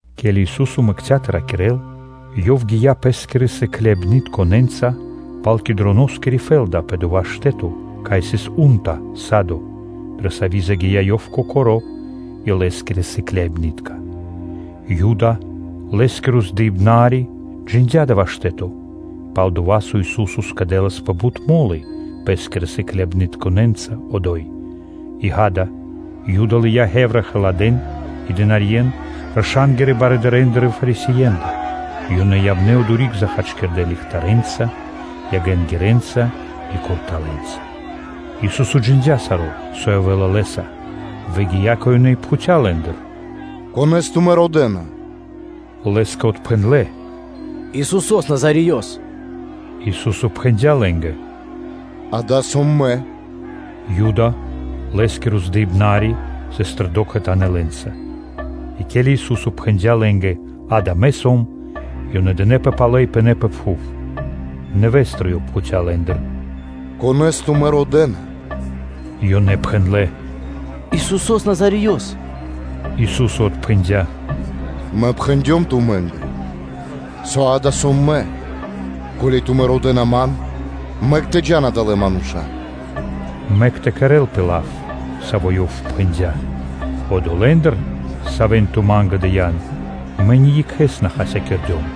Ке́ли Ису́со мэкця́ тэ ракирэ́л, Ёв гия́ Пэ́скирэ сыкляибнытконэ́нца пал Кедроноскири сы́гно рэ́кица (лэнори́) пэ дова́ штэ́то, кай сыс у́нта (садо), дрэ сави́ загия́ Ёв Кокоро́ и Лэ́скирэ сыкляибны́тка. О Юда, Лэ́скиро здыибнари, джиндя́ дава́ штэ́то, пал-дова́ со Ису́со скэдэласпэ бут мо́лы Пэ́скирэ сыкляибнытконэ́нца одо́й. И, ґа́да, Юда лыя́ хевра халадэ́н и дынарье́н, раша́нгирэ барыдырэндыр и Фарисиендыр, и ёнэ явнэ́ одори́к захачкирдэ ягэнца, ягэнгирэнца и курталэнца. Ису́со джиндя́ саро́, со явэ́ла Лэ́са, выгия́ кэ ёнэ и пхуця́ лэ́ндыр: “Конэ́с тумэ́ родэ́на?” Лэ́скэ отпхэндлэ́: “Исусо́с Назареёс.” Ису́со пхэндя́ лэ́нгэ: “Ѓа́да, сом Мэ.” О Юда, Лэ́скиро здыибнари, сыс тэрдо́ кхэтанэ́ лэ́нца. И ке́ли Ису́со пхэндя́ лэ́нгэ: “Ѓа́да, Мэ сом”, ёнэ дынэпэ палэ и пынэ́ пэ пхув. Нэвэ́стыр Ёв пхуця́ лэ́ндыр: “Конэ́с тумэ́ родэ́на?” Ёнэ пхэндлэ́: “Исусо́с Назареёс.” Ису́со отпхэндя́: “Мэ пхэндём тумэ́нгэ, со дава́ сом Мэ; ко́ли тумэ́ родэ́на Ман, мэк тэ джа́н адалэ́ мануша́, мэк тэ кэрэ́лпэ лав, саво́ Ёв пхэндя́: “Одолэ́ндыр, савэ́н Ту Ма́нгэ дыя́н, Мэ ни екхэ́с на хасякирдём”.”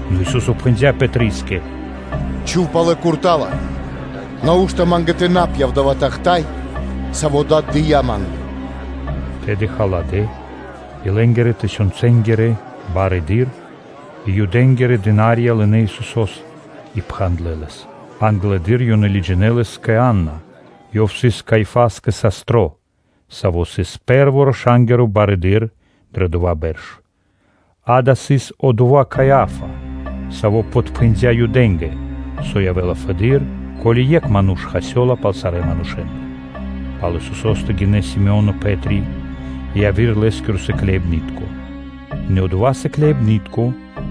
Нэ Ису́со пхэндя́ Пэтрискэ: “Чхув палэ курта́ла; нау́што Ма́нгэ тэ на пья́в дава́ тахта́й, саво́ Дад дыя́ Ма́нгэ?” Тэды халадэ́ и лэ́нгирэ-тысёнцэнгиро барыдыра́ и Юдэ́нгирэ дына́рья лынэ́ Исусо́с, и пхандлэ Лэс: англэды́р ёнэ лыджинэ́ Лэс кэ Анна; ёв сыс Каиафаскэ састро, саво́ сыс пэ́рво раша́нгиро барыдыро́ дро дова́ бэрш. Дава́ сыс одова́ Каиа́фа, саво́ подпхэндя Юдэ́нгэ, со явэ́ла фэды́р, ко́ли екх ману́ш хасёла пал сарэ́ манушэ́ндэ. Пал Исусо́стэ гинэ́ Си́моно Пэ́три и яви́р Лэ́скиро сыкляибны́тко. Нэ одова́ сыкляибны́тко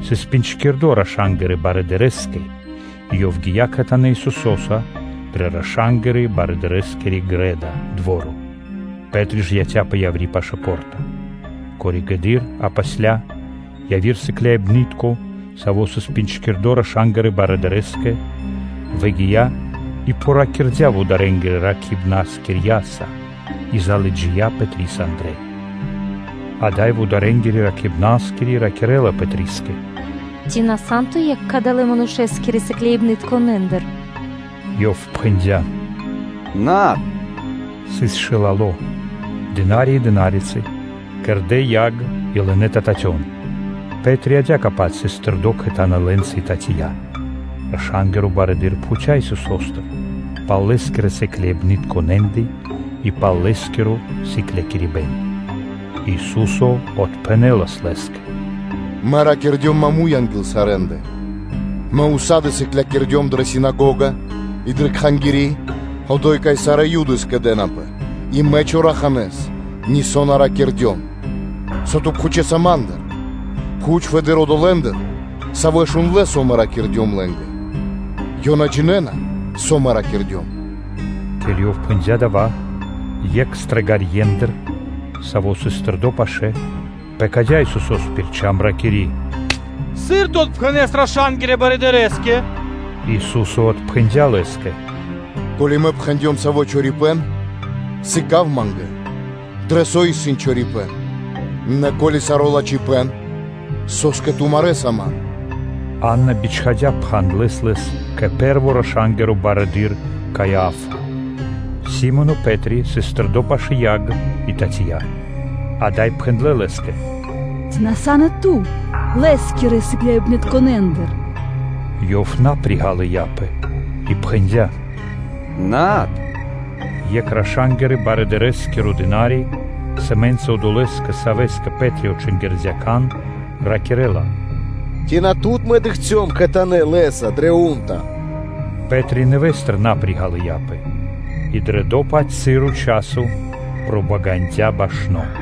сыс джиндло́ (пинджкирдо) раша́нгирэ барыдырэ́скэ и ёв гия́ кхэтанэ́ Исусо́са дрэ раша́нгирэ-барыдырэскири грэ́да (дво́ро). Пэ́три ж яця́пэ яври́ пашы́л по́рта. Коригэды́р (позжэды́р) яви́р сыкляибны́тко, саво́ сыс джиндло́ раша́нгирэ барыдырэ́скэ, выгия́ и пириракирдя вударэнгирэ ракхибнаскирьяса и залыджия́ Пэтрис андрэ́. Ада́й вударэнгири ракхибнаскири ракирэ́ла Пэтрискэ: “Ци на сан ту екх кадалэ́ Манушэ́скирэ сыкляибнытконэндыр? Ёв пхэндя́: “Над.” Сыс шылало, слу́ги (дына́рья) и дынарицы, кэрдэ́ яг и лынэ́ тэ татён; Пэ́три адя́кэ-паць сыс тэрдо́ кхэтанэ́ лэ́нца и татия. Раша́нгиро барыдыро́ пхуця́ Исусо́стыр пал Лэ́скирэ сыкляибнытконэндэ и пал Лэ́скиро сыклякирибэ́н. Ису́со отпхэнэ́лас лэ́скэ: “Мэ ракирдём маму́й (прямэс) анги́л сарэ́ндэ; Мэ ўса́ды (сак) сыклякирдём дрэ синагога и дрэ Кхангири́, одо́й, кай сарэ́ Юды скэдэ́напэ, и Мэ чораханэ́с нисо́ на ракирдём; со ту пхучэса Ма́ндыр? Пхуч фэды́р одолэ́ндыр, савэ́ шундлэ́, со Мэ ракирдём лэ́нгэ: ёнэ джинэ́на, со Мэ ракирдём.” Ке́ли Ёв пхэндя́ дава́, екх стрэгарьендыр, саво́ сыс тэрдо́ пашы́л, пэкадя́ Исусо́с пир чам (шчока), ракири́: “Сыр Ту отпхэнэса раша́нгирэ барыдырэ́скэ?” Ису́со отпхэндя́ лэ́скэ: “Ко́ли Мэ пхэндём саво́ чорипэ́н, сыка́в Ма́нгэ дрэ со исын чорипэ́н; нэ ко́ли саро́ лачхипэ́н, со́скэ ту марэ́са Ман?” Анна бичхадя́ пхандлэс Лэс кэ пэ́рво раша́нгиро барыдыро́ Каиа́фа. Си́моно (Пэ́три) сыс тэрдо́ пашы́л яг и татия. Ада́й пхэндлэ́ лэ́скэ: “Ци на сан и Ту Лэ́скирэ сыкляибнытконэндыр? Ёв на приґалыяпэ и пхэндя́: “Над.” Екх раша́нгирэ-барыдырэскиро дына́ри, сэмэ́нца одолэ́скэ, савэ́скэ Пэ́три отчингирдя кан, ракирэ́ла: “Ци на тут мэ дыкхцём кхэтанэ́ Лэ́са дрэ у́нта (садо)?” Пэ́три нэвэ́стыр на приґалыяпэ; и дрэ дова́-паць часо пробагандя башно.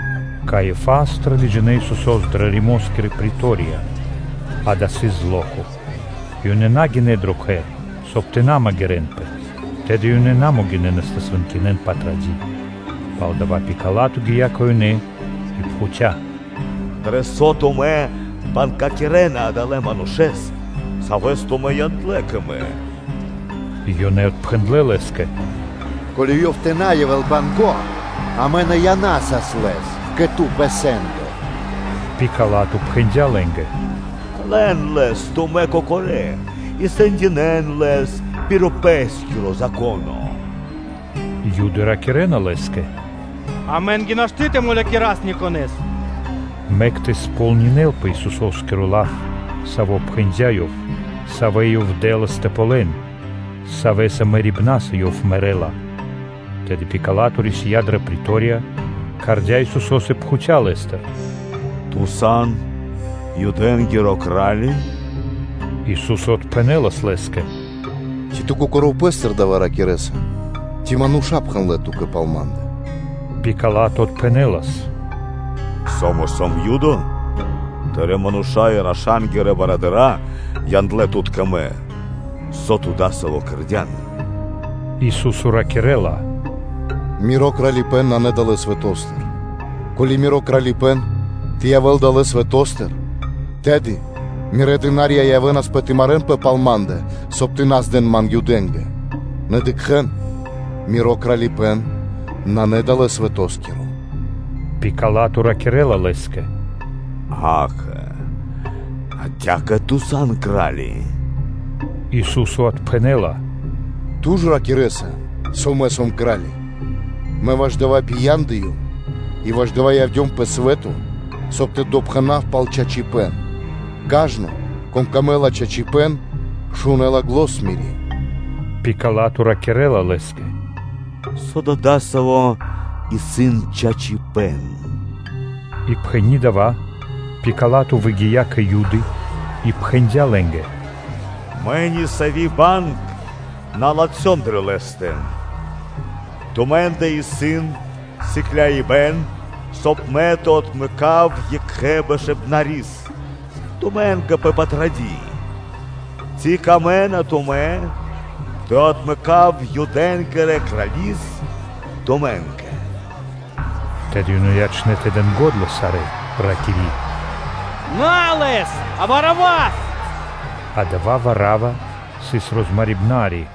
Каиафастыр лыджинэ́ Исусо́с дрэ Римоскири претория; дава́ сыс зло́ко (ра́нко). И ёнэ на гинэ́ дро кхэр, соб (кай) тэ на магирэнпэ, тэды ёнэ на могинэ́нас тэ свэнкинэн Патради́. Палдава́ Пила́то гия́ кэ ёнэ и пхуця́: “Дро со тумэ́ бангякирэна Адалэ́ Манушэ́с, Савэс тумэ́ яндлэ́ кэ мэ?” Ёнэ отпхэндлэ́ лэ́скэ: “Ко́ли (со) Ёв тэ на явэ́л банго́, амэ на янасас Лэс кэ ту пэ сэ́ндо.” Пила́то пхэндя́ лэ́нгэ: “Лэн Лэс тумэ́ кокорэ́ и сэндинэ́н Лэс пир пэ́скиро Зако́но.” Юды ракирэ́на лэ́скэ: “Амэ́нгэ нашты́ тэ мулякирас никонэ́с”; мэк тэ сполнинэ́лпэ Исусо́скиро лав, саво́ пхэндя́ Ёв, савэ́ Ёв дэ́лас тэ ґалён, савэ́ мэрибнаса Ёв мэрэ́ла. Тэды Пила́то рисия́ дрэ претория, кхардя́ Исусо́с и пхуця́ Лэ́стыр: “Ту сан Юдэ́нгиро Кра́ли?” Ису́со отпхэнэ́лас лэ́скэ: “Ци Ту Кокоро́ пэ́стыр дава́ ракирэ́са, ци мануша́ пхэндлэ́ ту́кэ пал Ма́ндэ?” Пила́то отпхэнэ́лас: “Со Мэ сом Юдо? Тырэ́ мануша́ и раша́нгирэ барыдыра́ яндлэ́ Тут кэ мэ; со Ту дасаво кэрдя́н?” Ису́со ракирэ́ла: “Миро Кралипэ́н исын на далэ́ свэто́стыр: ко́ли Миро Кралипэ́н тэ явэ́л далэ́ свэто́стыр, тэды Мирэ́ дына́рья явэ́нас тэ марэ́нпэ пал Ма́ндэ; соб (кай) Ман тэ на здэн Юдэ́нгэ; нэ дыкхэ́н, Миро Кралипэ́н исын на далэ́ свэтоскиро.” Пила́то ракирэ́ла Лэ́скэ: “Акэ, адя́кэ Ту сан Кра́ли?” Ису́со отпхэнэ́ла: “Ту ж ракирэ́са, со Мэ сом Кра́ли. Мэ ваш дава́ бияндыём и ваш дава́ явдём пэ свэ́то, соб (кай) тэ допхэнав пал чачипэ́н; кажно, конэ́скэ исын пир ило́ чачипэ́н, шунэ́ла зан Мири́” Пила́то ракирэ́ла Лэ́скэ: “Со да дасаво исын чачипэ́н?” И пхэни́ дава́, Пила́то выгия́ кэ Юды и пхэндя́ лэ́нгэ: “Мэ нисави́ банг на латхём дрэ Лэ́стэ. Тумэ́ндэ исын присыкляибэн, соб (кай) мэ тэ отмэкав екхэ бэшыбнарис тумэ́нгэ пэ Патради́; ци камэ́на тумэ́ тэ отмэкав Юдэ́нгирэ Крали́с тумэ́нгэ?” Тэды ёнэ ячнэ́ тэ дэн го́дла сарэ́, ракири́: “На Лэс, а Варавас.” Адава́ Варава сыс розмарибнари.